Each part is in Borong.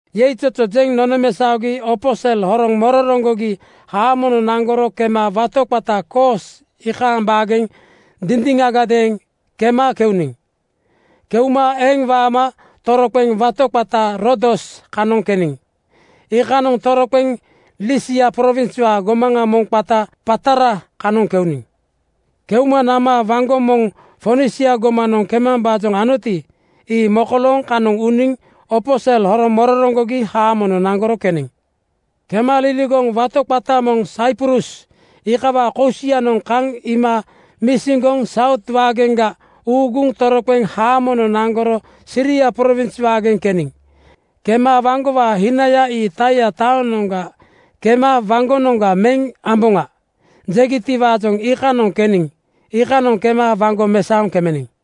Yeizozo jeŋ nonomesaogi opo sel horoŋ mororoŋgogi haamonoŋ naŋgoro kema wato qata Koos iikaaŋ baageŋ dindiŋagadeeŋ kema keuniŋ. Keuma eŋ waama toroqeŋ wato qata Rodos kanoŋ keniŋ. Iikanoŋa toroqeŋ Lisia prowinswaa gomaŋa moŋ qata Patara kanoŋ keuniŋ. Keuma nama waŋgo moŋ Fonisia gomanoŋ kemambaajoŋ anoti, ii mokolooŋ kanoŋ uniŋ opo sel horoŋ mororoŋgogi haamonoŋ naŋgoro keniŋ. Kema laligoŋ wato moŋ qata Saiprus iikawaa kosianoŋ kaŋ iima misiŋgoŋ Saut waageŋga uuguŋ toroqeŋ haamonoŋ naŋgoro Siria prowins waageŋ keniŋ. Kema “Waŋgowaa hinaya ii Taia taonoŋ kema waŋgonoŋga meŋ amboŋa,” jegitiwaajoŋ iikanoŋ keniŋ. Iikanoŋ kema waŋgo mesaoŋ kemeniŋ.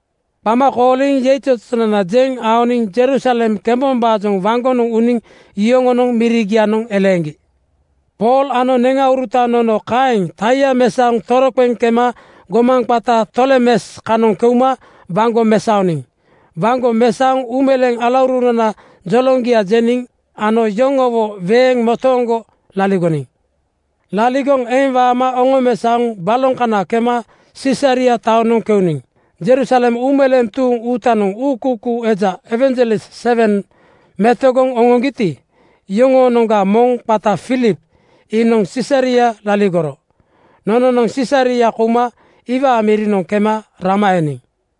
Qama kooliŋ yeizozonana jeŋ aoniŋ Jerusalem kembombaajoŋ waŋgonoŋ uniŋ yoŋonoŋ mirigianoŋ eleeŋgi. Pool ano neŋauruta nono kaeŋ Taia mesaoŋ toroqeŋ kema gomaŋ qata Tolemes kanoŋ keuma waŋgo mesaoniŋ. Waŋgo mesaoŋ uumeleeŋ alaurunana joloŋgia jeniŋ ano yoŋowo weeŋ motooŋgo laligoniŋ. Laligoŋ eŋ waama oŋomesaoŋ baloŋ kana kema Sisaria taonoŋ kouniŋ. Jerusalem uumeleeŋ tuuŋ uutanoŋ uukuukuu eja (ewanjelis) sewen metogoŋ oŋoŋgiti, yoŋoonoŋga moŋ qata Filip iinoŋ Sisaria laligoro. Nononoŋ Sisaria kouma iwaa mirinoŋ kema rama eniŋ.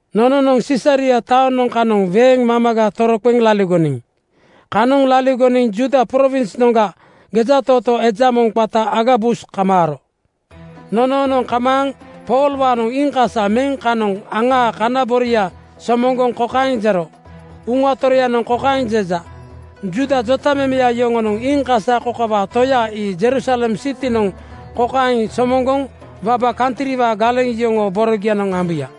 Nononoŋ Sisaria taoŋ kanoŋ weeŋ mamaga toroqeŋ laligoniŋ. Kanoŋ laligoniŋ Juuda prowinsnoŋga gejatootoo eja moŋ qata Agabus kamaaro. Nonoonoŋ kamaaŋ Poolwaanoŋ iiŋkasa meŋ kanoŋ aŋaa kana boria somoŋgoŋ kokaeŋ jero, “Uŋa Toroyanoŋ kokaeŋ jeja, ‘Juuda jotamemeya yoŋonoŋ iiŋkasa kokawaa toya ii Jerusalem sitinoŋ kokaeŋ somoŋgoŋ waba kantriwaa galeŋ yoŋoo borogianoŋ ambuya.’”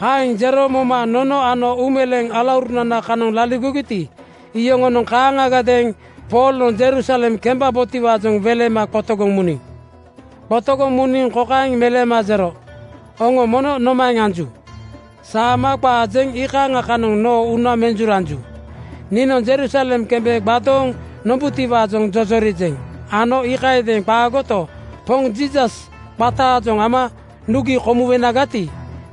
Kaeŋ jero moma nono ano uumeleeŋ alaurunana kanoŋ laligogiti, iyoŋonoŋ kaaŋgadeeŋ Poolnoŋ Jerusalem kembabotiwaajoŋ welema qotogoŋ muniŋ. Qotogoŋ muniŋ kokaeŋ meleema jero, “Oŋo mono nomaeŋ anju? Saama qaa jeŋ iikaaŋa kanoŋ noo uuna menjuranju. Niinoŋ Jerusalem kembe gbadooŋ nombutiwaajoŋ jojorijeŋ ano iikayadeeŋ qaagoto, Poŋ Jiisas qataajoŋ ama nugi komuwenagati,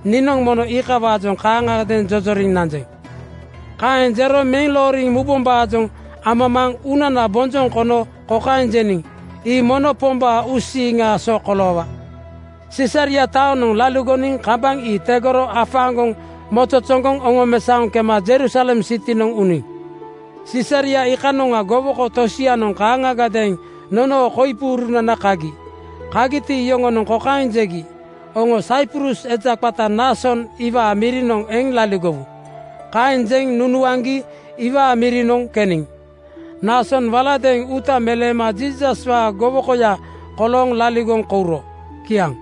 niinoŋ mono iikawaajoŋ kaaŋagadeeŋ jojoriŋ nanjeŋ.” Kaeŋ jero meŋ looriŋ mubombaajoŋ amamaaŋ uunana bonjoŋ kono kokaeŋ jeniŋ, “Ii mono Pombaa uusiiŋaa so koloowa.” Sisaria taonoŋ laligoniŋ kambaŋ ii tegoro afaaŋgoŋ mozozoŋgoŋ oŋomesaoŋ kema Jerusalem sitinoŋ uniŋ. Sisaria iikanoŋa gowoko tosianoŋ kaaŋagadeeŋ nonoo koipunana kagi. Kagiti, yoŋonoŋ kokaeŋ jegi, “Oŋo Saiprus eja qata Naason iwaa mirinoŋ eŋ laligowu.” Kaeŋ jeŋ nunuaŋgi iwaa mirinoŋ keniŋ. Naasonoŋ waladeeŋ uuta meleema Jiisaswaa gowokoya kolooŋ laligoŋ kouro. Kiaŋ.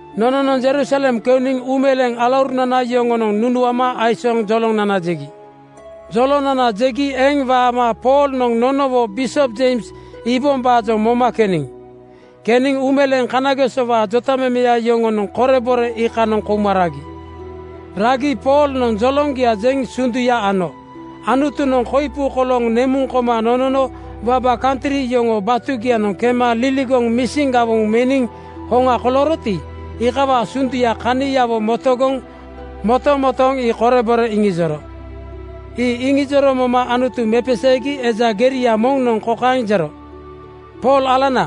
Nononoŋ Jerusalem keuniŋ uumeleeŋ alaurunana yoŋonoŋ nunuama aisooŋ jolonana jegi. Jolonana jegi eŋ waama Poolnoŋ nonowo bisop Jeims iibombaajoŋ moma keniŋ. Keniŋ uumeleeŋ kanagesowaa jotamemeya yoŋonoŋ korebore iikanoŋ kouma ragi. Ragi Poolnoŋ joloŋgia jeŋ sunduya ano. Anutunoŋ koipu kolooŋ nemuŋ koma nonono waba kantri yoŋoo batugianoŋ kema liligoŋ misin gawoŋ meniŋ hoŋa kolooroti, iikawaa sunduya kaniawo motogoŋ motomotooŋ ii korebore iŋijoro. Ii iŋijoro moma Anutu mepeseegi eja geria moŋnoŋ kokaeŋ jero, “Pool alanana,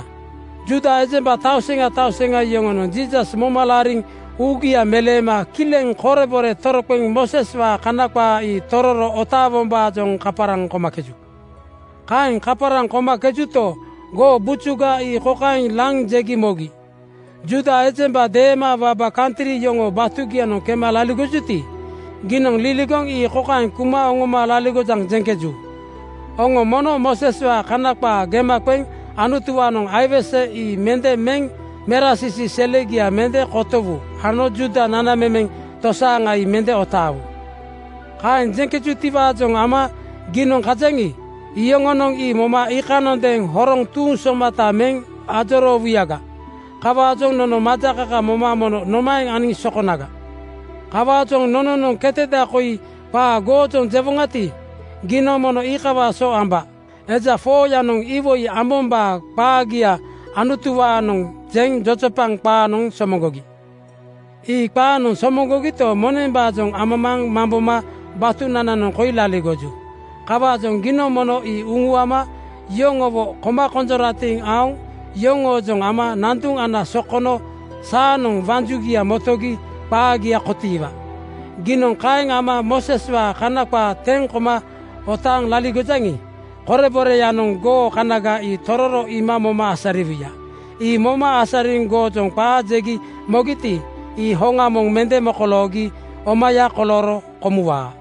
Juuda ejemba tauseŋa tauseŋa yoŋonoŋ Jiisas moma laariŋ uugia meleema kileŋ korebore toroqeŋ Mooseswaa Kana qaa ii tororo otaawombaajoŋ kaparaŋ komakeju. Kaeŋ kaparaŋ komakejuto, goo bujuga ii kokaeŋ laŋ jegi mogi, ‘Juuda ejemba deema waba kantri yoŋoo batugianoŋ kema laligojuti, giinoŋ liligoŋ ii kokaeŋ kuma oŋoma laligojaŋ, jeŋkeju, “Oŋo mono Mooseswaa kana qaa gema qeŋ Anutuwaanoŋ aiwese ii mende meŋ merasisi selegia mende kotowu ano Juuda nanamemeŋ tosaaŋa ii mende otaawu.” ’ “Kaeŋ jeŋkejutiwaajoŋ ama giinoŋ kajaŋi, iyoŋonoŋ ii moma iikanondeeŋ horoŋ tuuŋ somata meŋ ajoroowuyaga. Kawaajoŋ nono majakaka moma mono nomaeŋ aniŋ sokonaga? Kawaajoŋ nononoŋ keteda koi qaa goojoŋ jewoŋati, giinoŋ mono iikawaa so amba. Eja 4:yanoŋ iwoi ambombaa qaagia Anutuwaanoŋ jeŋ jojopaŋ qaanoŋ somoŋgogi. Ii qaanoŋ somoŋgogito, monembaajoŋ amamaaŋ mamboma batunananoŋ koi laligoju. Kawaajoŋ giinoŋ mono ii uŋuama yoŋowo koma konjoratiŋ aoŋ yoŋoojoŋ ama nanduŋ ana sokono saanoŋ waŋ jugia motogi qaagia kotiiwaa. Giinoŋ kaeŋ ama Mooseswaa Kana qaa teŋ koma otaaŋ laligojaŋi, koreboreyanoŋ goo kanaga ii tororo iima moma asariwuya. Ii moma asariŋ goojoŋ qaa jegi mogiti, ii hoŋa moŋ mende mokoloogi omaya kolooro komuwaa.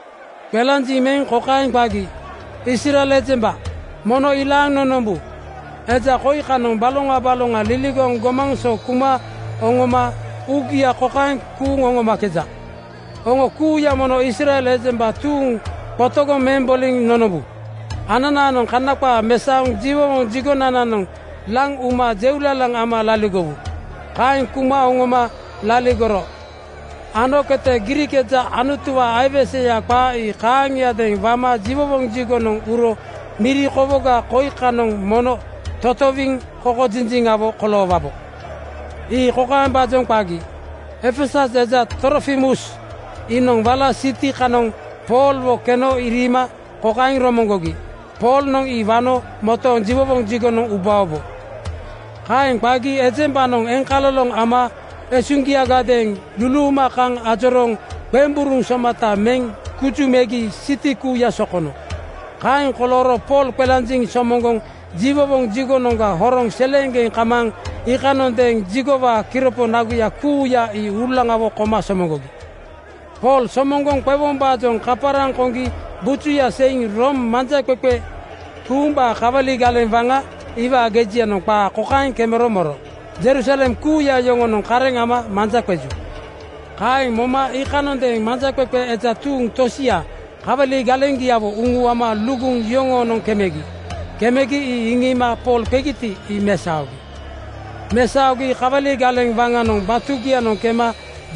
Qelanjiŋ meŋ kokaeŋ qagi, “Israel ejemba, mono ilaaŋ nonombu! Eja koi kanoŋ baloŋa baloŋa liligoŋ gomaŋ so kuma oŋoma uugia kokaeŋ kuuŋ oŋomakeja: Oŋo kuuya mono Israel ejemba tuuŋ qotogoŋ meŋ boliŋ nonombu. Ananaanoŋ Kana qaa mesaoŋ jiwowoŋ jigonananoŋ laŋ uma jeulalaŋ ama laligowu. Kaeŋ kuma oŋoma laligoro ano kete Griik eja Anutuwaa aiweseya qaa ii kaaŋiadeeŋ wama jiwowoŋ jigonoŋ uro miri kowoga koi kanoŋ mono totowiŋ kokojinjiŋawo koloowabo.” Ii kokaembaajoŋ qagi: Efesus eja Trofimus iinoŋ wala siti kananoŋ Poolwo keno iriima kokaeŋ romoŋgogi: Poolnoŋ ii wano motooŋ jiwowoŋ jigonoŋ ubaobo. Kaeŋ qagi ejembanoŋ eŋkaloloŋ ama esuŋgiagadeeŋ luluuma kaŋ ajorooŋ qemburuŋ somata meŋ guju megi siti kuuya sokono. Kaeŋ kolooro Pool qelanjiŋ somoŋgoŋ jiwowoŋ jigonoŋga horoŋ seleeŋgeŋ kamaaŋ iikanondeeŋ jigowaa kiropo naguya kuuya ii uulaŋawo koma somoŋgogi. Pool somoŋgoŋ qewombaajoŋ kaparaŋ koŋgi bujuya seiŋ Room manjaqeqe tuumbaa kawali galeŋ waŋa iwaa gejianoŋ qaa kokaeŋ kemero moro, “Jerusalem kuuya yoŋonoŋ kareŋ ama manja qeju.” Kaeŋ moma iikanondeeŋ manjaqeqe eja tuuŋ tosia kawali galeŋgiawo uŋuama luguŋ yoŋoonoŋ kemegi. Kemegi ii iŋiima Pool qegiti, ii mesaogi. Mesaogi kawali galeŋ waŋanoŋ batugianoŋ kema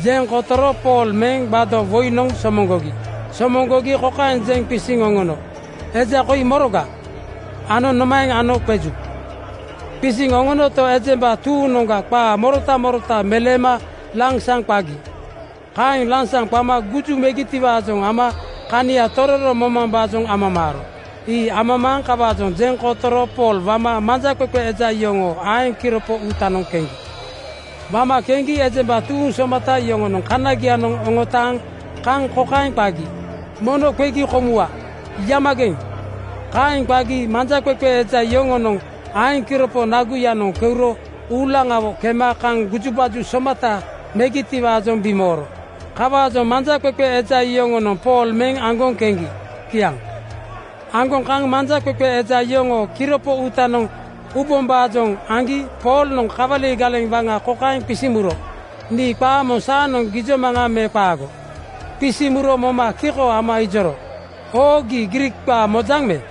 jeŋ kotoro Pool meŋ gbado (tape) woinoŋ somoŋgogi. Somoŋgogi kokaeŋ jeŋ qisiŋ oŋono, “Eja koi moroga?” ano “Nomaeŋ ano qeju?” Qisiŋ oŋonoto, ejemba tuuŋnoŋga qaa morota morota meleema lansaŋ qagi. Kaeŋ lansaŋ qama guju megitiwaajoŋ ama kania tororo momambaajoŋ amamaaro. Ii amamaaŋ kawaajoŋ jeŋ kotoro Pool wama manjaqeqe eja yoŋoo aeŋ kiropo uutanoŋ keŋgi. Wama keŋgi ejemba tuuŋ somata yoŋonoŋ kanagianoŋ oŋotaaŋ kaŋ kokaeŋ qagi, “Mono qegi komuwa. Yamageŋ!” Kaeŋ qagi manjaqeqe eja yoŋoo aeŋ kiropo naguyanoŋ keuro uulaŋawo kema kaŋ gujubaju somata megitiwaajoŋ bimooro. Kawaajoŋ manjaqeqe eja yoŋonoŋ Pool meŋ aŋgoŋ keŋgi. Kiaŋ. Aŋgoŋ kaŋ manjaqeqe eja yoŋoo kiripo uutanoŋ ubombaajoŋ aŋgi Poolnoŋ kawali galeŋ waŋa kokaeŋ qisiŋ muro, “Nii qaa moŋ saanoŋ gijomaŋa me qaago?” Qisiŋ muro moma kiko ama ijoro, “Oo, gii Griik qaa mojaŋ me?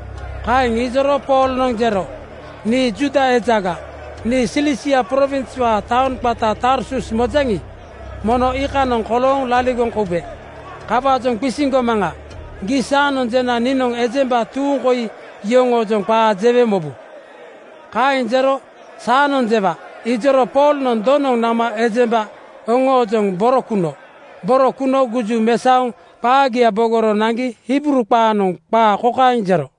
Kaeŋ ijoro Poolnoŋ jero, “Nii Juuda ejaga. Nii Silisia prowinswaa taoŋ qata Tarsus mojaŋi, mono iikanoŋ kolooŋ laligoŋ koube. Kawaajoŋ qisiŋ gomaŋa: Gii saanoŋ jena niinoŋ ejemba tuuŋ koi yoŋoojoŋ qaa jewe mobu.” Kaeŋ jero “Saanoŋ jewa,” ijoro Poolnoŋ donoŋ nama ejemba oŋoojoŋ boro kuno. Boro kuno guju mesaoŋ qaagia bogoro naŋgi Hibruu qaanoŋ qaa kokaeŋ jero,